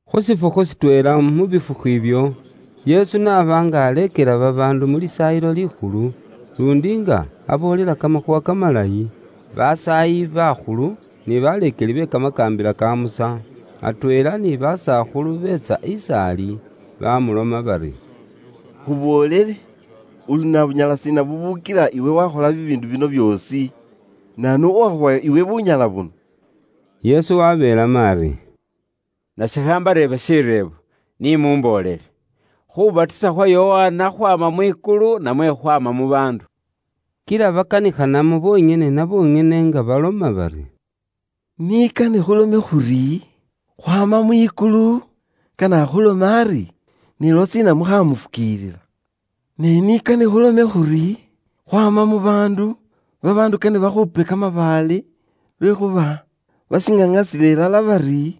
Khu shifukhu shitweela mu bifukhu ibyo, Yesu n'aba nga aleekela babaandu mu Lisaayilo Likhulu, luundi nga aboolela kamakhuuwa kamalayi, basaayi bakhulu ni baleekeli be kamakaambila ka Musa, atweela ni basakhulu beetsa is'ali, bamuloma bari, “Khuboolele, uli na bunyala shiina bubukila iwe wakhola bibiindu bino byoosi? Naanu uwakhuwa iwe bunyala buno?” Yesu wabeelamo ari, “Nase khambareebe shireebo; ni mumboolele, Khubatisa khwa Yokana khwaama mwikulu namwe khwaama mu baandu?” Kila bakanikhanamo bonyene na bonyene nga baloma bari, “Ni kane khulome khuri, khwaama mwikulu, kane akhulome ari, ne lwashiina mukhaamufukiilila? Ne ni kane khulome khuri, khwaama mu baandu, babaandu kane bakhuupe kamabaale lwekhuuba bashiŋaŋasila ilala bari,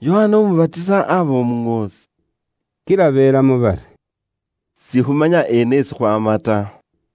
Yokana Umubatisa aba Umuŋoosi.” Kila belamo bari, “Sikhumanya eena esi khwaama ta.”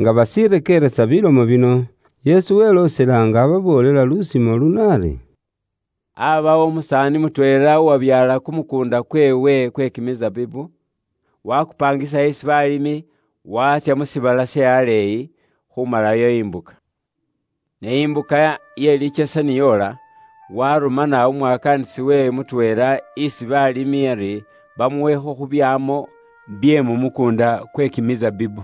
Nga bashirekeeresa bilomo bino, Yesu weloosela nga ababoolela lusimo luno ari: “Aabawo umusaani mutweela uwabyaala kumukuunda kweewe kwe kimisabibu, waakupaangisa isi baalimi, waatsya mu shiibala she aleeyi, khuumalayo imbuka. Ne imbuka ye likyesa ni yoola, waarumana umwakaanisi weewe mutweela isi baalimi, ari bamuwekho khu byaamo bye mu mukuunda kwe kimisabibu.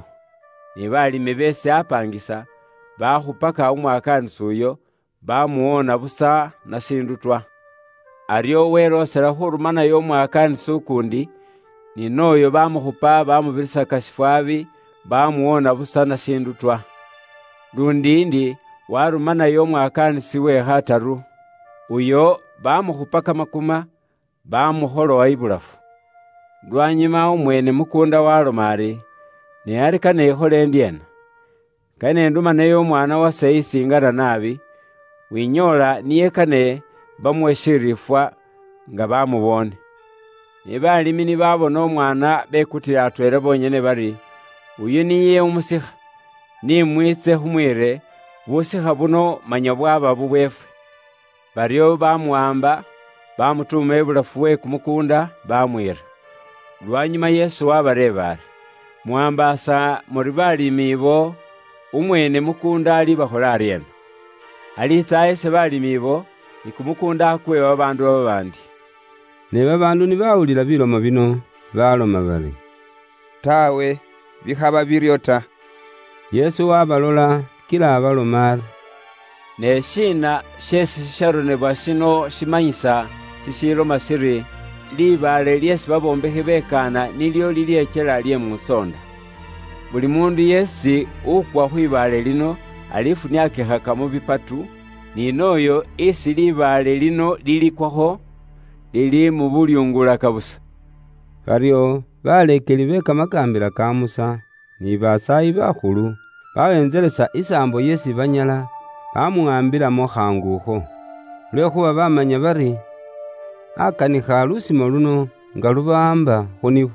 Ne balimi beesi apaangisa, baakhupaka umwakaanisi uyo, baamuwoona busa na shiindu twa. Aryo weloosela khuurumanayo umwakaanisi ukuundi, ne ni nooyo baamukhupa, baamubirisaka shifwaabi, baamuwoona busa na shiindu twa. Luundi ndi waarumanayo umwakaanisi uwe khataru, oyu baamukhupa kamakuma, baamukholowa ibulafu. “Lwanyuma umweene mukuunda waaloma ari, ‘Ne ari kane ikhole ndyeena? Kane indumeyo umwaana wase isi ingana naabi, winyoola niye kane bamuwe shiriifwa nga bamuboone.’ “Ne baalimi ni baabona umwaana bekutila atweela bonyene bari, ‘Oyu niye umusikha, ni mwiitse khumwiire, busikha buno manya bwaba bubweefwe.’ Baryo baamuwaamba baamutuuma ibulafu we kumukuunda, baamwiira.” Lwanyuma Yesu waabareeba ari, “Mwaambaasa muri baalimi ibo, umweene mukuunda alibakhola aryeena? Aliitsa ahese baalimi ibo, ni kumukuunda akuwe babaandu babaandi.” Ne babaandu ni baawulila bilomo bino, baloma bari, “Taawe, bikhaba biryo ta.” Yesu waabalola kila abaloma ari, “Ne shiina sheesi shisharonebwa shino shimanyisa, shishiiloma shiri, ‘Libaale lyeesi babombekhi bekaana nilyo lilyekyela lye musoonda?’ Buli muundu yeesi wukwa khwibaale lino, alifuniakikhaka mu bipatu, ni nooyo isi libaale lino lilikwakho, lilimubulyungulaka busa.” Baryo baleekeli be Kamakaambila ka Musa, ni basaayi bakhulu, baweentselesa isaambo yeesi banyala bamuwaambilamo khaangu akho, lwekhuuba baamanya bari, akanikha lusimo luno nga lubawaamba khu nibo.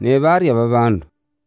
Ne baarya babaandu.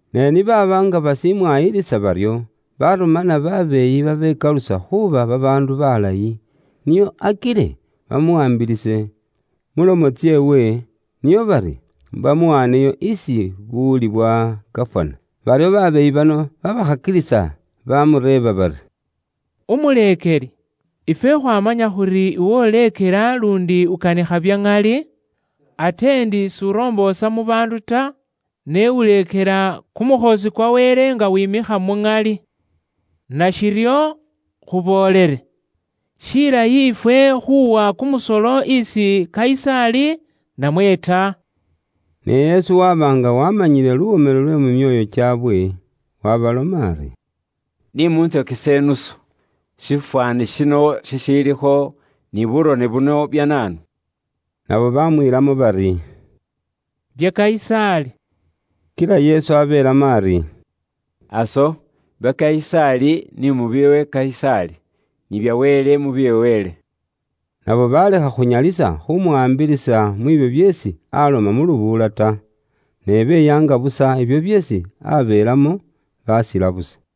Ne ni baaba nga bashimwayilisa baryo, barumana babeeyi babekalusa khuuba babaandu balayi, nio akile bamuwaambilise mulomo tseewe, nio bari bamuwaaneyo isi buwuli bwa gafana. Baryo babeeyi bano babaakhakilisa bamureeba bari, “Umuleekeli, ifwe khwaamanya khuri iwe uleekela luundi ukanikha bya ŋali, ate ndi s'uromboosa mu baandu ta, ne uleekela kumukhoosi kwa Wele nga wimikha muŋali. Nashiryo, khuboolele, shilayi ifwe khuuwa kumusolo isi Kayisaali, namwe ta?” Ne Yesu waba nga waamanyile luwomelo lwe mu myoyo kyaabwe, waabaloma ari, “Ni muntsokese idinari. Shifwaani shino shishiilikho, ni burone buno bya naanu?” Nabo bamwiilamo bari, “Bya Kayisaali.” Kila Yesu abeelamo ari, “Aso, bya Kayisaali, ni mubiwe Kayisaali, ni bya Wele, mubiwe Wele.” Nabo balekha khunyalisa khumuwaambilisa mwiibyo byeesi aloma mu lubuula ta. Ne beyaanga busa ibyo byeesi abeelamo, basila busa.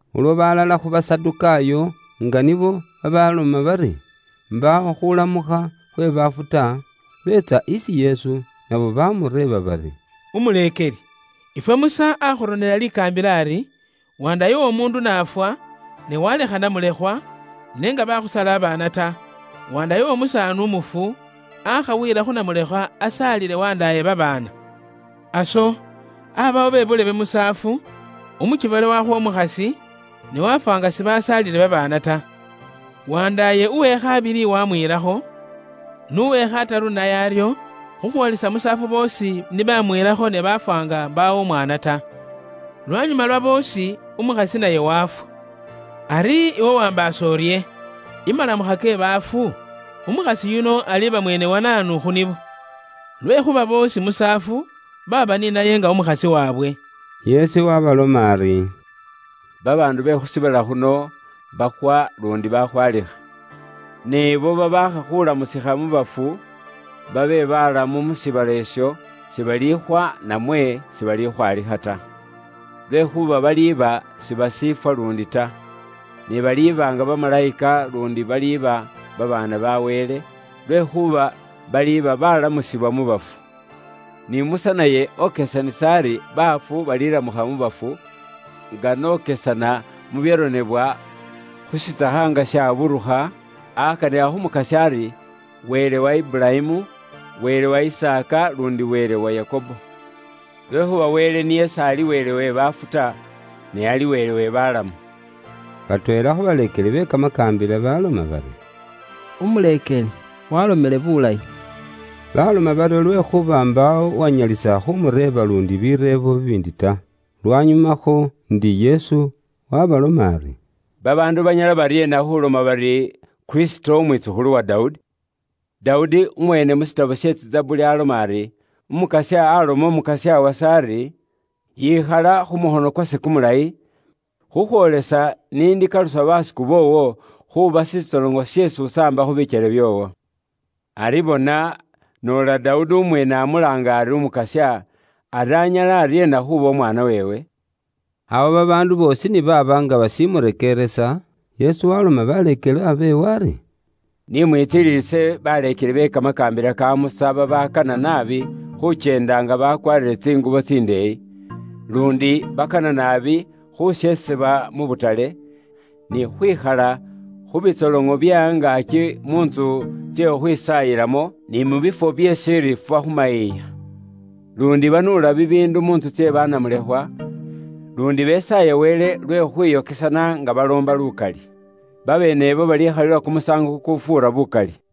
Ulwo balala khu Basadukaayo nga nibo babaloma bari, mbaawo khulamukha khwe baafu ta, beetsa isi Yesu, nabo bamureeba bari, “Umuleekeli, ifwe Musa akhuronela likaambila ari, ‘wandaaye w'omuundu n'afwa, ne walekha namulekhwa, ne nga bakhusaala babaana ta, wandaaye w'omusaani umufu, aakha wiila khu namulekhwa, asaalile wandaaye babaana.’ Aso abaawo be buulebe musaafu; umukiboole wakhwa umukhasi, ne wafwa nga sibasaalile babaana ta. Wandaaye uwe khabili wamwiilakho, n'uwe khataru naye aryo, khukhwoolesa musaafu boosi ni bamwiilakho ne baafwa nga mbaawo umwaana ta. Lwanyuma lwa boosi, umukhasi naye wafwa. Ari iwe waambaasa urye, imalamukha ke bafu, umukhasi yuno aliiba mwene wa naanu khu nibo? Lwekhuuba boosi musaafu baaba ni naye nga umukhasi waabwe.” Yesu waabeelamo ari, “Babaandu be khu shiibala khuno, bakhwa luundi bakhwaalikha. Ne abo babaakha khuulamukha khukhwaama mu bafu babe baalamu mu shiibala isho, sibalikhwa namwe sibalikhwaalikha ta, lwekhuuba baliiba sibashiifwa luundi ta. Ne baliiba nga bamalayika luundi baliba babaana ba Wele, lwekhuuba baliba baalamukhile khukhwaama mu bafu. Ni Musa naye okesanisa ari baafu balilamukha khukhwaama mu bafu, nga n'okesana mu byaronebwa khu shitsakha she kamawa nga shaburukha; akanikha khu Mukasya ari, ‘Wele wa Iburayimu, Wele wa Isaaka, luundi Wele wa Yakobo.’ Lwekhuuba Wele niye s'ali Wele we baafu ta, ne ali Wele we balamu.” Batweela khu baleekeli be Kamakaambila baloma bari, “Umuleekeli walomele bulayi.” Baloma baryo lwekhuuba mbaawo uwanyalisa khumureeba luundi bireebo bibiindi ta. Lwanyumakho ndi, Yesu waabaloma ari, “Babaandu banyala baryeena khuloma bari, Kristo Umwitsukhulu wa Dawudi? Dawudi umweene mu burone bwe Tsizabuli aloma ari, ‘Umukasya aloma Umukasya wase ari, yikhala khu mukhono kwase kumulayi, khukhwoolesa ni ndikalusa basiku boowo khuuba shitsoloŋo sheesi usambakho bikyele byoowo.’ Ari bona, noola Dawudi umweene amulaanga ari Umukasya, ari anyala aryeena khuuba umwaana weewe?” Awo babaandu boosi ni baaba nga bashimurekeeresa, Yesu waloma baleekelwa beewe ari, “Ni mwitsililise baleekeli be Kamakaambila ka Musa babakana naabi khukyenda nga bakwaarire tsingubo tsindeeyi, luundi bakana naabi khusheesebwa mu butale, ni khukhwikhala khu bitsoloŋo bye angaaki mu ntsu tsye khukhwisaayilamo, ni mu bifwo bye shiriifwa khu mayiiya. Luundi banuula bibiindu mu ntsu tsye banamulekhwa, luundi besaaya Wele lwe khukhwiyokesana nga baloomba lukali. Babeenebo balikhalilwa kumusaango kukufuura bukali.”